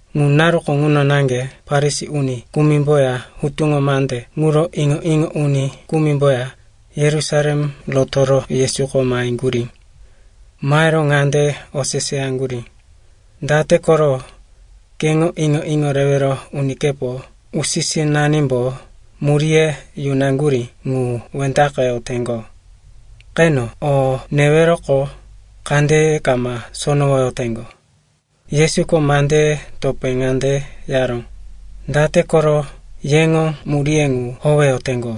Ŋu naruko ŋuno naŋge Farisi uni kumimboya hutuŋo mande ŋuro iŋo-iŋo uni kumimboya Yerusalem rotoro Yesuko maheŋgurí. Mahero ŋande oseseyaŋgurí, “Date koro keŋo iŋo-iŋo rewero unikepo usi-sinanimbo muríye yunaŋgurí ŋu wendaqeyoteŋgo? Qeno, o neweroqo, kandeye kama sonowoyoteŋgo.” Yesuko mandeye topé ŋande yaró, “Date koro yeŋo muríye ŋu howeyoteŋgo,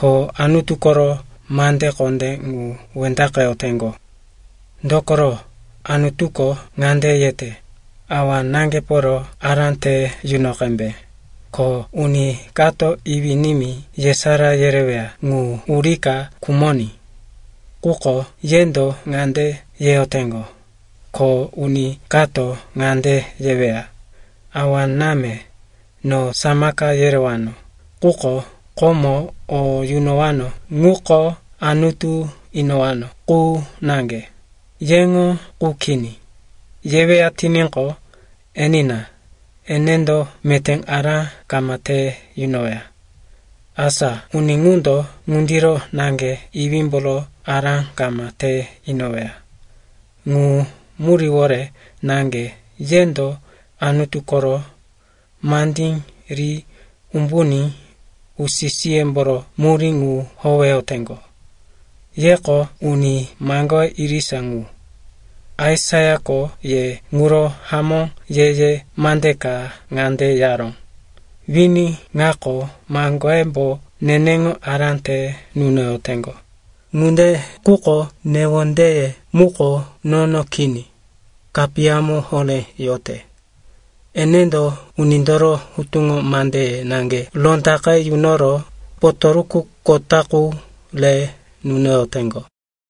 ko Anutu koro mande kondé ŋu wendaqeyoteŋgo? Dokoro Anutuko ŋande yete, ‘Awa-náŋgeporo ará te yuno qembe,’ ko ‘Uni kato iwí-nimí yesará yereweya ŋu urika khumoní.’ Quko yendo ŋande yeyoteŋgo, ko uni kato ŋande yeweya, ‘Awa-náme, no samaka yerewano, quko komo o yunowano ŋuko Anutu inowano qu naŋge, yeŋo qu kini,’ yeweya tiníqo, enina, enendo meté ará kama te yunoweya. Asa uni ŋundo ŋundiro naŋge iwímboro ará kama te inoweya. Ŋu muríwore naŋge yendo Anutu koro mandí ri umbuní usi-siyemboro murí ŋu howeyoteŋgo. Yeko uni maŋgoye irisa ŋu. Aisaiako ye ŋuro hamó ye-ye mande ka ŋande yaró, “‘Wini ŋako maŋgoyembo neneŋo ará te nunoyoteŋgo, quko newondeye muko nono kini, kapiyamo horé yote. Enendo unindoro hutuŋo mandeye naŋge rondaqe yunoro potoruku kota qu re nunoyoteŋgo.’”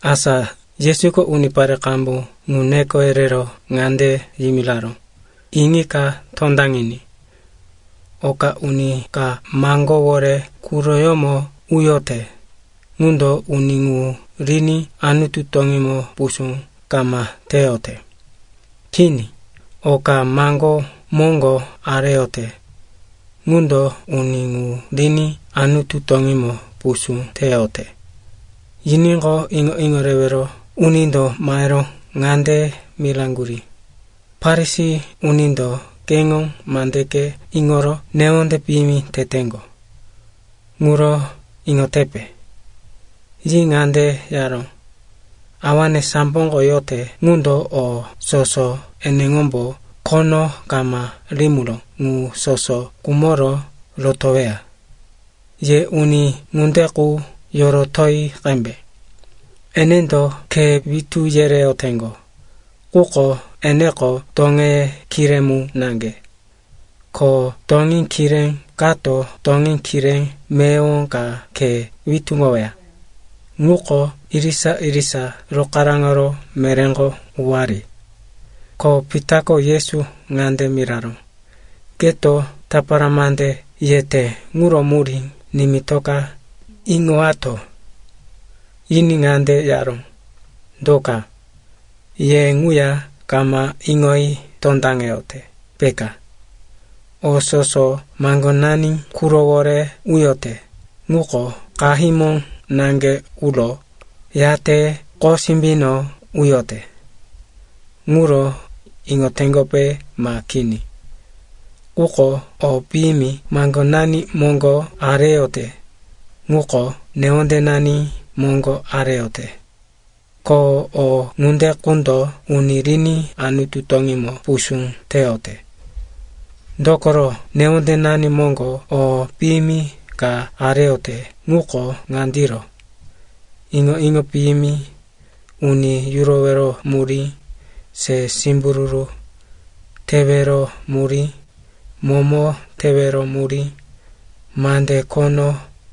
Asa Yesuko unipare qambu ŋu neko yerero ŋande yimiraró, “Iŋika tondaŋiní. Oka uni ka maŋgówore quroyómo uyote, ŋundo uni ŋu riní Anutu toŋímo pusú kama teyote. Kini, oka maŋgó moŋgo areyote, ŋundo uni ŋu riní Anutu toŋímo pusú teyote.” Yiníqo, iŋo-iŋo rewero unindo mahero ŋande miraŋgurí, “Farisi unindo keŋo mandeke iŋoro newonde piyimi teteŋgo. Ŋuro iŋotepe?” Yi ŋande yaró, “Awane samboko yote ŋundo o soso eneŋombo khono kama rimiró ŋu soso kumoro rotoweya. Ye uni ŋunde qu yorotoyi qembe. Enendo khe witú yereyoteŋgo, quko eneko toŋeye kiré mu naŋge. Ko toŋí kiré kato toŋí kiré meyowo ka khe witúŋoweya, ŋuko irisa-irisa rokaráŋoro meréko uwari.” Ko Pitako Yesu ŋande miraró, “Keto tapara mande yete ŋuro murí nimitoka iŋowato.” Yiní ŋande yaró, “Do ka? Ye ŋuya kama iŋoyi tondaŋeyote, peka? O soso maŋgonani qurowore uyote, ŋuko qahímo naŋge uro, yate qosimbino uyote. Ŋuro iŋoteŋgope ma kini? Quko o piyimi maŋgonani moŋgo areyote, ŋuko newondenani moŋgo areyote. Ko o ŋunde qundo uni riní Anutu toŋímo pusú teyote. Dokoro newondenani moŋgo o piyimi ka areyote ŋuko ŋandiro: iŋo-iŋo piyimi, uni yurowero murí, se simbururu tewero murí, momo tewero murí, mande khono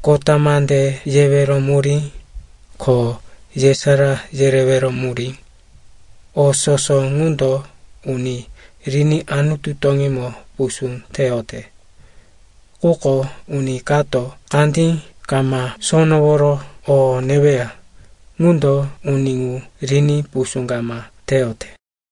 kota mande yewero murí, ko yesará yerewero murí. O soso ŋundo uni riní Anutu toŋímo pusú teyote. Quko uni kato kandí kama sonoworo o neweya, ŋundo uni ŋu riní pusú kama teyote.”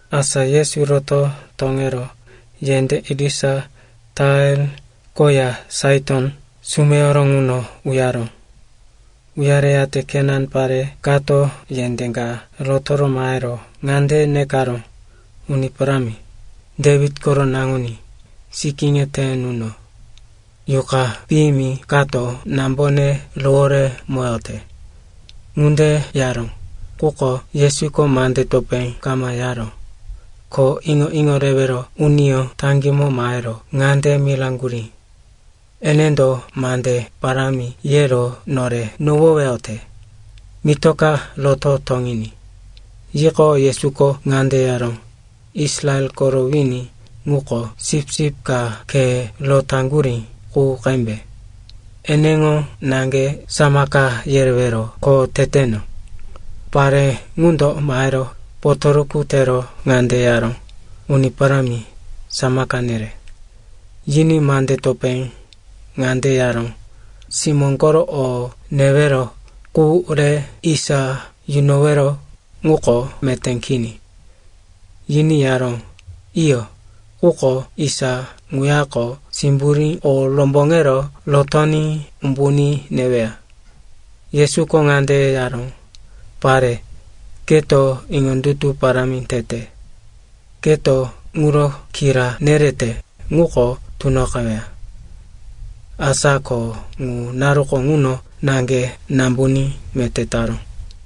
Asa Yesu roto toŋero yendé irisa Tair koya Saiton sumeyoro ŋuno uyaró. Uyareyate Kenan pare kato yendé ka rotoro mahero ŋande nekaró, “Uni Parámi, Dewit koro Naŋuní, sikíne te nuno. Yuqa piyimi kato nambone roworemoyote.” Ŋunde yaró, quko Yesuko mande topé kama yaró. Ko iŋo-iŋo rewero uniyó taŋgímo mahero ŋande miraŋgurí, “Enendo mande parámi yero nore nohoweyote. Mitoka roto toŋiní.” Yiqo, Yesuko ŋande yaró, “Israel koro wini ŋuko sipsip ka khe rotaŋgurí qu qembe. Eneŋo naŋge samaka yerewero kho teteno.” Pare ŋundo mahero potoruku tero ŋande yaró, “Uni Parámi, samaka nere.” Yiní mande topé ŋande yaró, “Simó koro o newero qu re isa yunowero ŋuko meté kini.” Yiní yaró, “Iyo, quko isa ŋuyako simburí o romboŋero rotoní umbuní neweya.” Yesuko ŋande yaró, “Pare, keto iŋondutu parámi tete. Keto ŋuro kira nerete ŋuko tunoqeweya.” Asa ko ŋu naruko ŋuno naŋge nambuní meté taró.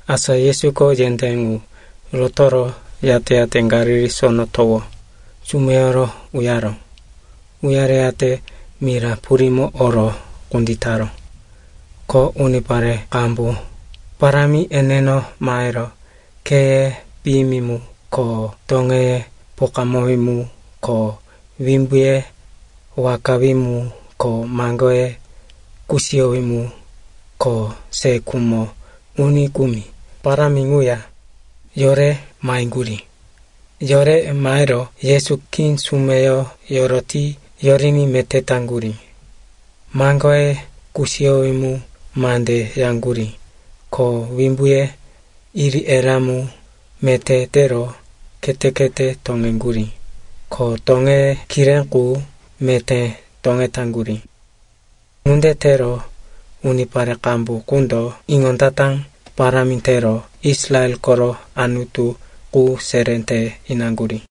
Asa Yesuko yendé ŋu rotoro, yate-yate Galili Sono Towo sumeyoro uyaró. Uyareyate mira purímo oro kunditaró. Ko unipare qambu parámi eneno mahero kheye piyimi mu ko toŋeye pokamowí mu ko wimbuye wakawí mu ko maŋgoye kusiyowí mu ko se khumo uni kumi parámi ŋuya yore maheŋgurí. Yore mahero Yesu khí sumeyo yoroti yoriní meté taŋgurí. Maŋgoye kusiyowí mu mande yaŋgurí, ko wimbuye iri-erá mu meté tero khete-khete toŋeŋgurí, ko toŋeye kiré qu meté toŋetaŋgurí. Ŋunde tero unipare qambu qundo iŋondata parámi tero Israel koro Anutu qu seré te inaŋgurí.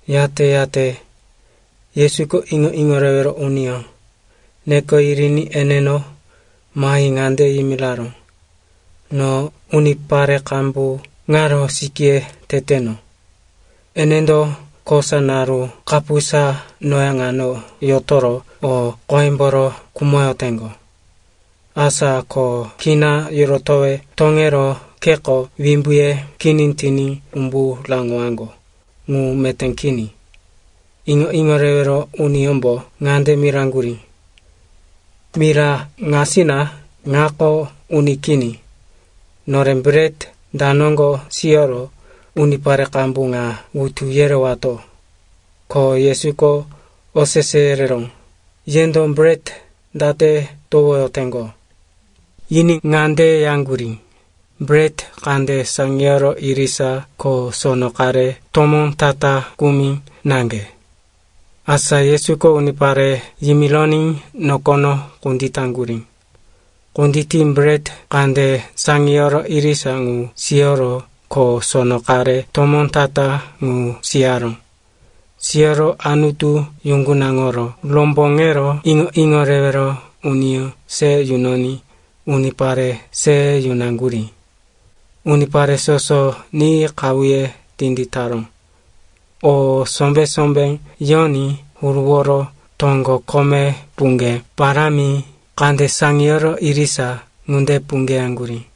Yate-yate Yesuko iŋo-iŋo rewero uniyó neko yiriní eneno mahi ŋande yimiraró, “No unipare qambu ŋaro sikíye teteno. Enendo kosa naru kapusa noya ŋano yotoro o qoyemboro khumoyoteŋgo. Asa ko kina yorotowe toŋero kheko wimbuye kini tiní umbu raŋowaŋgo ŋu meté kini.” Iŋo-iŋo rewero uniyómbo ŋande miraŋgurí, “Mira ŋasina ŋako uni kini. Nore bret da noŋgo siyoro unipare qambu ŋa wutu yerewato?” Ko Yesuko osese yereró, “Yendo bret date towoyoteŋgo?” Yiní ŋande yaŋgurí, “Bret kande saŋiyoro irisa ko sono qare tomó ta-ta kumi naŋge.” Asa Yesuko unipare yimironí nokono kunditaŋgurí. Kunditi bret kande saŋiyoro irisa ŋu siyoro ko sono qare tomó ta-ta ŋu siyaró. Siyoro Anutu yuŋgunaŋoro romboŋero iŋo-iŋo rewero uniyó se yunoní unipare se yunaŋgurí. Unipare soso ni qahuye tinditaró. O sombé-sombé yoní huruworo toŋgo kome puŋge parámi kande saŋiyoro irisa ŋunde puŋgeyaŋgurí.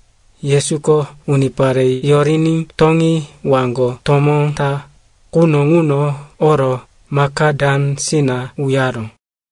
Yesuko unipare yoriní toŋi waŋgo tomó ta quno ŋuno oro Makadansina uyaró.